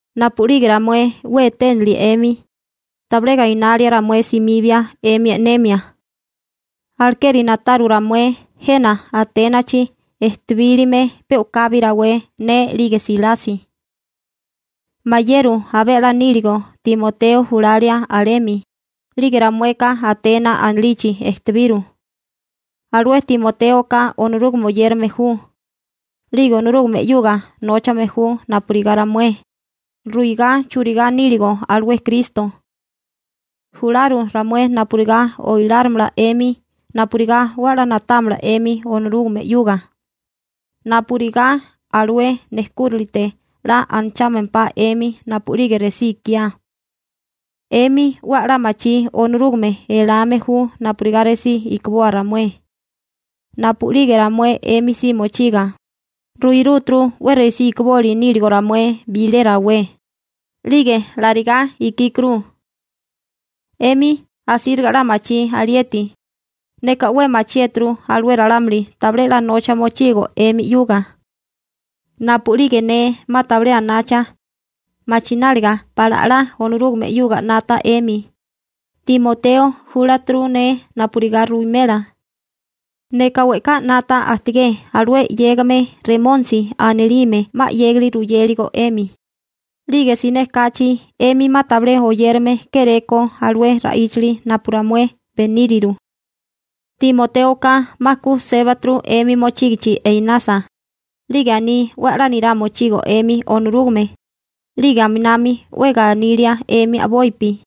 Napu'lige ramué 'we eténilie 'emi, tabilé gainali ramué simibia 'emi e'nemia. Alekeri na'taru ramué jena Aténachi ejtibílime pe u'kabi rawé ne 'lige Silasi. Mayeru abé 'la níligo Timoteo julalia alemi, 'lige ramueka Atena anilichi ejtebiru. Alué Timotéoka Onorúgame oyérame ju, 'lige Onorúgame 'yuga nóchame ju napurigá ramué, ruigá churigá níligo alué Kristo. Jularu ramué napurigá oilárimala 'emi napurigá 'we a'lá na'támala 'emi Onorúgame 'yuga, napurigá alué nejkúralite 'la anachámempá 'emi napu'lige resí ikiá. 'Emi 'we a'lá machí Onorúgame elame ju napurigá resí ikiboa ramué. Napu'lige ramué 'emi si mochiga, ruirúturu 'we resí ikiboli níligo ramué bilé rawé, 'lige larigá ikíkuru. 'Emi asíriga 'la machí alieti. Neka 'we machiéturu alué ralámuli tabilé 'la nocha mochigo 'emi 'yuga. Napu'lige ne 'ma tabilé anacha, machináliga pala 'la Onorúgame 'yuga 'nata 'emi, Timoteo júlaturu ne napurigá ruwimela. Neka we'ká 'nata ajtigé alué 'yégame Remónisi anilime 'ma 'yégali ruyéligo 'emi, 'lige siné kachi 'emi 'ma tabilé oyérame kéré ko alué ra'íchali napu ramué beníriru. Timotéoka 'ma ku sébaturu 'emi mochígichi einasa, 'lige aní 'we a'lá nirá mochigo 'emi Onorúgame, 'lige aminami 'we ganilia 'emi a'bopi.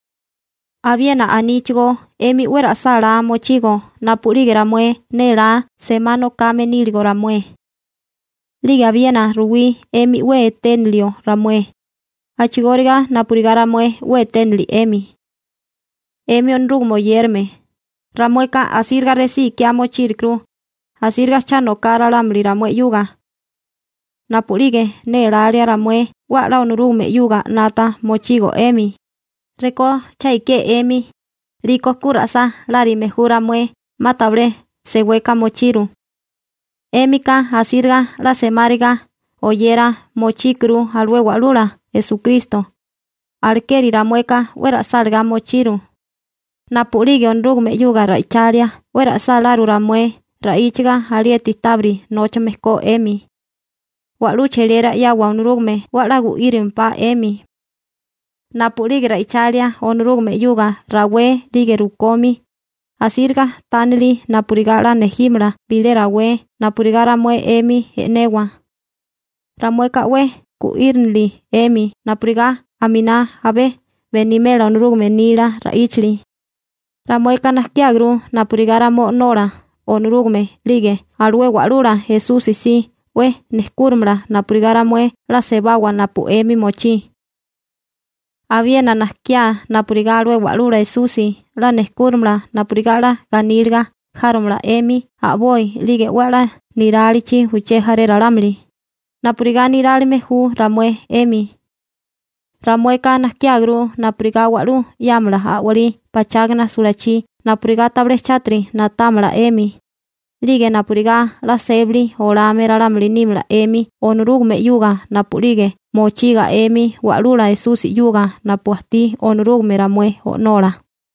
Abiena aníchigó 'emi 'we ra'sálá mochigo napu'lige ramué nélá semá nokame níligo ramué. 'Lige abiena ruwí 'emi 'we eténilio ramué, a'chigóriga napurigá ramué 'we eténili 'emi. 'Emi Onorúgame oyérame, ramueka asíriga resí ikiá mochírukuru, asíriga cha noká ralámuli ramué 'yuga. Napu'lige nélália ramué 'we a'lá Onorúgame 'yuga 'nata mochigo 'emi, rekó cha ikié 'emi, 'liko ku ra'sálárime ju ramué 'ma tabilé seweka mochiru. 'Émika asíriga 'la semáriga oyera mochíkuru alué Wa'lula Esukristo, alekeri ramueka 'we ra'sálagá mochiru. Napu'lige Onorúgame 'yuga ra'ichalia 'we ra'sáláru ramué ra'íchaga alieti tábiri nóchame ko 'emi. Wa'lú cheliera 'yawa Onorúgame 'we a'lá gu'írilimpá 'emi. Napu'lige ra'ichalia Onorúgame 'yuga rawé 'lige rukomi, asíriga tánilia napurigá 'la nejímala bilé rawé napurigá ramué 'emi e'newa. Ramueka 'we gu'írinili 'emi napurigá aminá abé benimela Onorúgame nila ra'íchali. Ramueka najkiáguru napurigá ramué O'nola Onorúgame 'lige alué Wa'lula Esusi si 'we nejkúrimala napurigá ramué 'la sebawa napu 'emi mochí. Abiena najkiá napurigá alué Wa'lula Esusi 'la nejkúrimala napurigá 'la ganíliga járomala 'emi a'boi 'lige 'we a'lá nirálichi uché jaré ralámuli, napurigá nirálime ju ramué 'emi. Ramueka najkiáguru napurigá wa'lú 'yámala a'walí pachágana sulachí napurigá tabilé chátiri na'támala 'emi, 'lige napurigá 'la sébali olame ralámuli nímala 'emi Onorúgame 'yuga napu'lige mochiga 'emi Wa'lula Esusi 'yuga napu ajtí Onorúgame ramué O'nola.